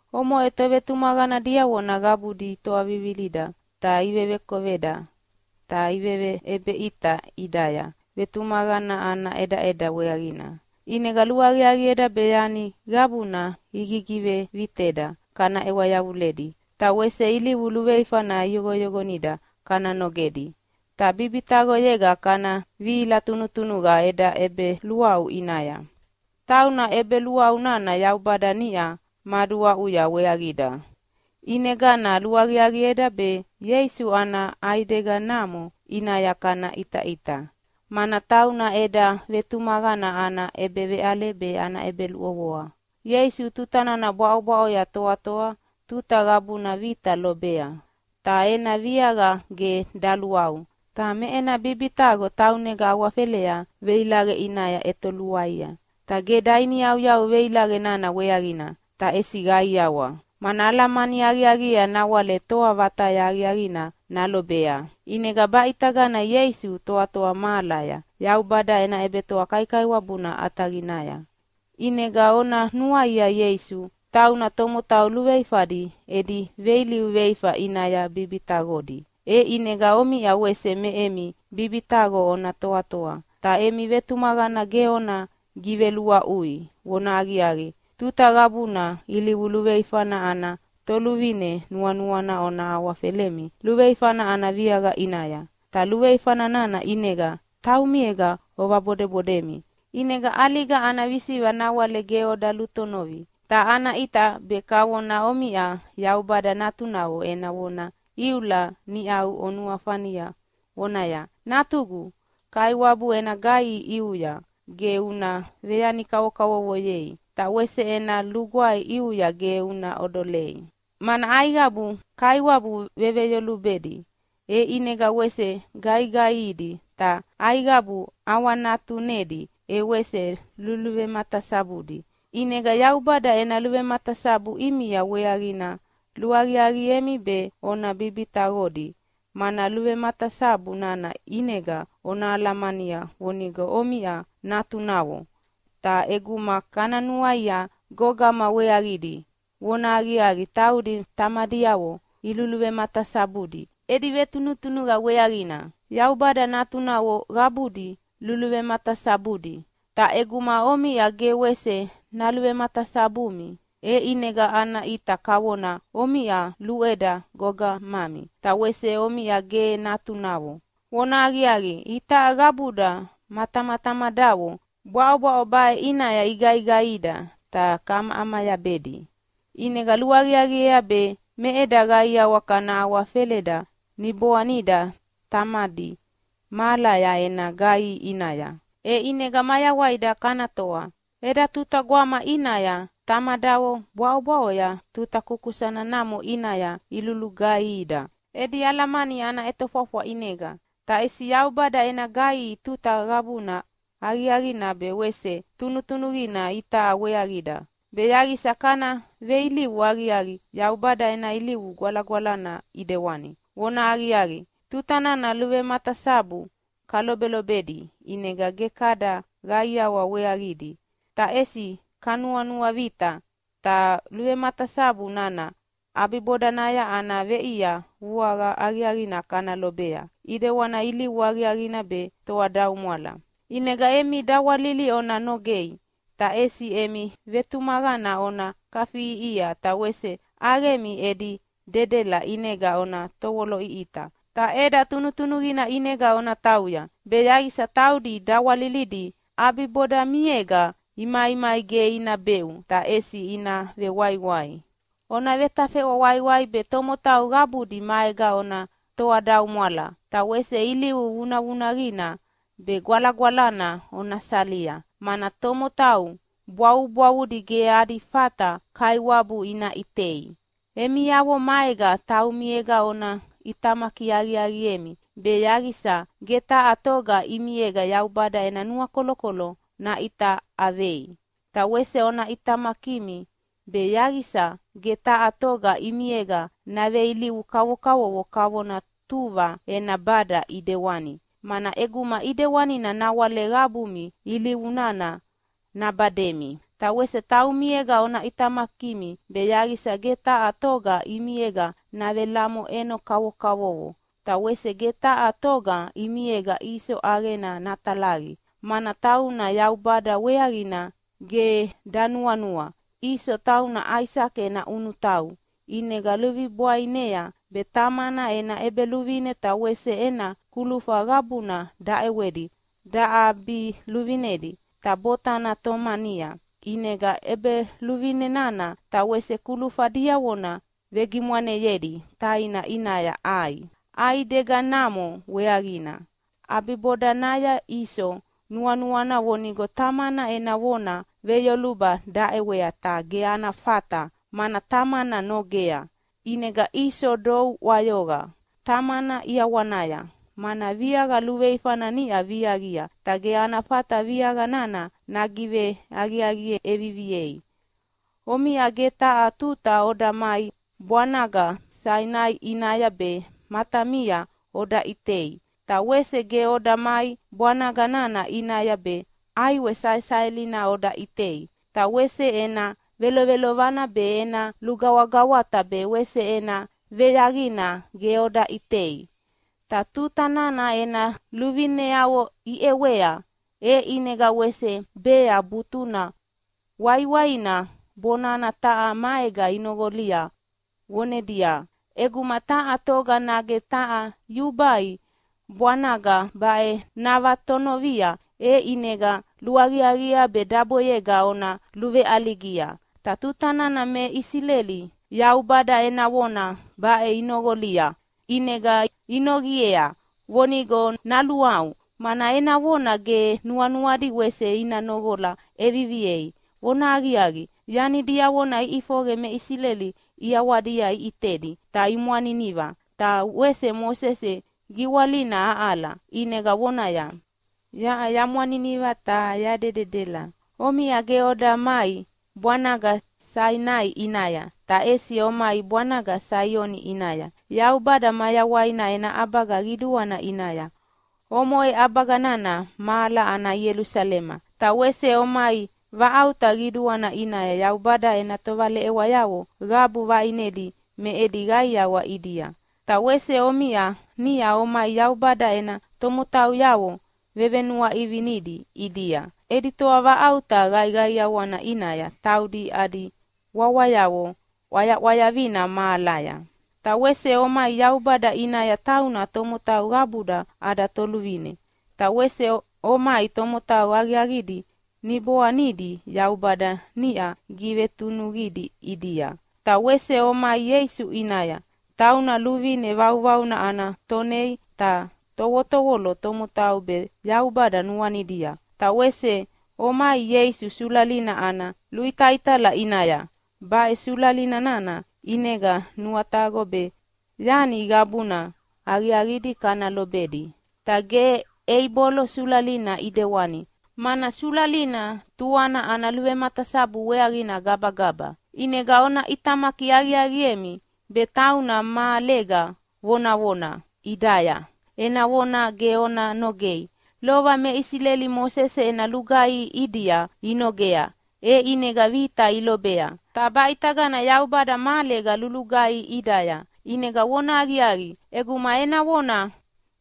Omoʼe tovetumaqana diavona qabudi itoavivilida ta ivevekoveda ta iveveʼebeʼita ʼidaya vetumaqana ana ʼedaʼeda weaqina. ʼInega luaqiaqieda be yani qabuna igigiveviteda kana ʼewa yavuledi, ta wese ilivu luveifana iyoqoyoqonida kana nogedi, ta bibitaqoyega kana vihila tunutunuqa eda ʼebeluaʼu ʼinaya, tauna ʼebeluaʼu nana Yaubada niʼa maduaʼuya weaqida. ʼInegana luaqiaqieda be Ieisu ana ʼaideganamo ʼinaya kana ʼitaʼita, mana tauna eda vetumaqana ana ʼebeveʼale be ana ʼebeluʼovoa. Ieisu tuta nana bwaʼobwaʼoya toatoa tuta qabuna vita lobea, ta ena viaqa ge daluaʼu. Ta me ena bibitaqo taunega awafelea veilaqe ʼinaya ʼetoluaia, ta ge dainiyauyau veilaqe nana weaqina, ta ʼesi qaiawa, mana alamani aqiaqiea nawale toa vataya aqiaqina nalobea. ʼInega baʼitagana Ieisu toatoa mahalaya Yaubada ena ʼebetoa kaikaiwabuna ʼataqinaya. ʼInega ona nuaia Ieisu, tauna tomotau luveifadi edi veilivu veifa ʼinaya bibitaqodi, e ʼinega omiʼa wese me emi bibitaqo ona toatoa, ta emi vetumaqana ge ona giveluaʼui. Vonahaqiaqi, tuta qabuna ilivu luveifana ana toluvine nuanuana ona awafelemi luveifana ana viaqa ʼinaya, ta luveifa nana ʼinega taumiega ovabodebodemi, ʼinega ʼaliga ana visiqa nawale ge oda lutonovi. Ta ana ʼita be kavona omiʼa Yaubada natunavo ena vona iula niʼau onuafania vonaya, “Natugu, Kaiwabu ena gaihi ʼiuya ge una veyani kavokavovoyei, ta wese ena lugwae ʼiuya ge una ʼodolei, mana aiqabu Kaiwabu veveyolubedi e ʼinega wese gaigaihidi, ta aiqabu ʼawanatunedi e wese luluvematasabudi.” ʼInega Yaubada ena luvematasabu ʼimia weaqina luaqiaqiemi be ona bibitaqodi, mana luvematasabu nana ʼinega ona alamania vonigo omiʼa natunavo. Ta ʼeguma kana nuaia gogama weaqidi, vonahaqiaqi taudi tamadiavo iluluvematasabudi edi vetunutunuqa weaqina. Yaubada natunavo qabudi luluvematasabudi, ta ʼeguma omiʼa ge wese naluvematasabumi, e ʼinega ana ʼita kavona omiʼa luʼeda gogamami ta wese omiʼa ge natunavo. Vonahaqiaqi, itaʼa qabuda ma tamatamadavo bwaʼobwaʼo baʼe ʼinaya igaigaihida ta kaʼamayabedi, ʼinega luaqiaqiea be me eda qaiawa kana awafeleda niboanida Tamadi mahalaya ena gaihi ʼinaya, e ʼinega mayawaida kana toa. Eda tuta gwama ʼinaya tamadavo bwaʼobwaʼoya tuta kukusana namo ʼinaya ilugaihida edi alamani ana ʼetofwafwa ʼinega. Ta ʼesi Yaubada ena gaihi tuta qabuna aqiaqina be wese tunutunuqina itaʼa weaqida, be yaqisa kana veilivu aqiaqi Yaubada ena ilivu gwalagwalana ʼidewani. Vonahaqiaqi, tuta nana luvematasabu kalobelobedi ʼinega ge kada qaiawa weaqidi, ta ʼesi kanuanuavita. Ta luvematasabu nana ʼabibodanaya ana veʼia vuaqa aqiaqina kana lobea ʼidewani ilivu aqiaqina be toadaumwala. ʼInega emi dawalili ona nogei, ta ʼesi emi vetumaqana ona kafiʼiʼihia ta wese ʼaqemi edi dedela ʼinega ona tovoloʼiʼita! Ta “ʼeda tunutunuqina ʼinega ona tauya”, be yaqisa taudi dawalilidi ʼabibodamiega imaimai ge ina beʼu ta ʼesi ina vewaiwai. Ona vetafeʼwa waiwai be tomotau qabudi maega ona toadaumwala, ta wese ilivu vunavunaqina be gwalagwalana ona salia, mana tomotau bwavubwavudi ge adi fata Kaiwabu ina ʼitei. Emiavo maega taumiega ona ʼitamaki aqiaqiemi be yaqisa ge taha toga ʼimiega Yaubada ena nuakolokolo naʼitaʼavei. Ta wese ona ʼitamakimi be yaqisa ge taha toga ʼimiega naveilivu kavokavovo kavona tuva ena bada ʼidewani, mana ʼeguma ʼidewanina nawale qabumi ilivu nana nabademi. Ta wese taumiega ona ʼitamakimi be yaqisa ge taha toga ʼimiega navelamoʼeno kavokavovo. Ta wese ge taha toga ʼimiega Iso ʼaqena natalaqi, mana tauna Yaubada weaqina ge danuanua. Iso tauna Aisake ena ʼunutau, ʼinega luvibwainea be tamana ena ʼebeluvine ta wese ena kulufa qabuna daʼewedi daʼabiluvinedi. Ta botana tomania ʼinega ʼebeluvine nana ta wese kulufa diavona vegimwaneyedi taina ʼinaya ʼai ʼaidegana namo weaqina. ʼAbibodanaya Iso nuanuana vonigo tamana ena vona veyoluba daʼewea, ta ge ana fata mana tamana nogea. ʼInega Iso dou ʼwayoqa tamana ʼiawanaya, mana viaqa luveifana niʼa viaqia, ta ge ana fata viaqa nana nagiveaqiaqi ʼeviviei. Omiʼa ge taha tuta oda mai bwanaga Sainai ʼinaya be matamia oda ʼitei. Ta wese ge oda mai bwanaga nana ʼinaya be ʼaiwe saesaelina oda ʼitei, ta wese ena velovelovana be ena lugawagawata be wese ena veyaqina ge oda ʼitei. Ta tuta nana ena luvineavo iʼewea, e ʼinega wese bea butuna waiwaina bona taha maega inoqolia vonedia, “ʼEguma taha toga nage taha yubai bwanaga baʼe navatonovia, e ʼinega luaqiaqiea be daboyega ona luveʼaligia.” Ta tuta nana me Isileli Yaubada ena vona baʼe inoqolia ʼinega inoqiea vonigo naluaʼu, mana ena vona ge nuanuadi wese ina noqola ʼeviviei. Vonahaqiaqi, yani diavona iʼifoqe me Isileli ʼiawadia iʼitedi ta imwaniniva, ta wese Mosese giwalina aʼala ʼinega vonaya, “Yaʼa yamwaniniva ta yadededela.” Omiʼa ge oda mai bwanaga Sainai ʼinaya, ta ʼesi omai bwanaga Saioni ʼinaya, Yaubada mayawaina ena ʼabaga qiduana ʼinaya. Omoʼe ʼabaga nana mahala ana Ielusalema. Ta wese omai vaʼauta qiduana ʼinaya Yaubada ena tovaleʼewayavo qabu vaʼinedi me edi qaiawa ʼidia. Ta wese omiʼa niʼa omai Yaubada ena tomotauyavo vevenuaʼivinidi ʼidia edi toavaʼauta qaiqaiawina ʼinaya, taudi adi wawayavo ʼwayaʼwayavina mahalaya. Ta wese omai Yaubada ʼinaya, tauna tomotau qabuda ada Toluvine. Ta wese omai tomotau aqiaqidi niboanidi Yaubada niʼa givetunuqidi ʼidia. Ta wese omai Ieisu ʼinaya, tauna luvine vauvauna ana Tonei ta tovotovolo tomotau be Yaubada nuanidia. Ta wese omai Ieisu sulalina ana luitaitala ʼinaya. Baʼe sulali nana ʼinega nuataqo be yani qabuna aqiaqidi kana lobedi, ta ge Eibolo sulalina ʼidewani, mana sulalina tuana ana luvematasabu weaqina gabagaba. ʼInega ona ʼitamaki aqiaqiemi, be tauna mahalega vonavona ʼidaya ena vona ge ona nogei. Lova me Isileli Mosese ena lugaihi ʼidia inogea e ʼinega vita ilobea. Ta baʼitagana Yaubada mahalega lulugaihi ʼidaya, ʼinega vonahaqiaqi, ʼeguma ena vona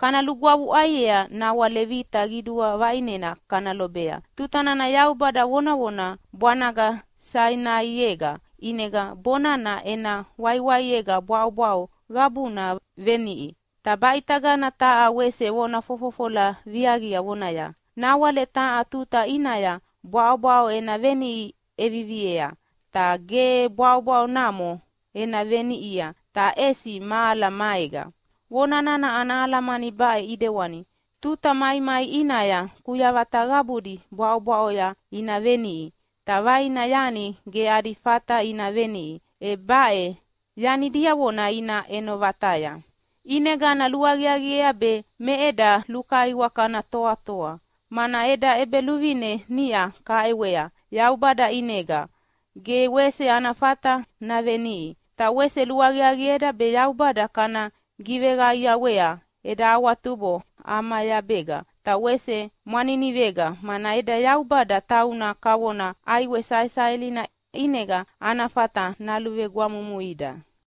kana lugwavuʼaiea, nawale vita qidua vaʼinena kana lobea. Tuta nana Yaubada vonavona bwanaga Sainaiega, ʼinega bonana ena waiwaiega bwaʼobwaʼo qabuna veniʼi. Ta baʼitagana taha wese vona fofofola viaqia vonaya, “Nawale taha tuta ʼinaya bwaʼobwaʼo ena veniʼi ʼeviviea, ta ge bwaʼobwaʼo namo ena veniʼia, ta ʼesi mahala maega.” Vona nana ana alamani baʼe ʼidewani: Tuta maimai ʼinaya kuyavata qabudi bwaʼobwaʼoya ina veniʼi. Ta vaina yani ge adi fata ina veniʼi, e baʼe yani diavona ina ʼeno vataya. ʼInegana luaqiaqiea be me eda lukaiwa kana toatoa, mana eda ʼEbeluvine niʼa kaʼewea Yaubada ʼinega ge wese ana fata naveniʼi. Ta wese luaqiaqieda be Yaubada kana giveqaiawea eda awatubo ʼamayabega ta wese mwaninivega, “mana eda Yaubada tauna kavona ʼaiwe saesaelina”, ʼinega ana fata naluvegwamumuida.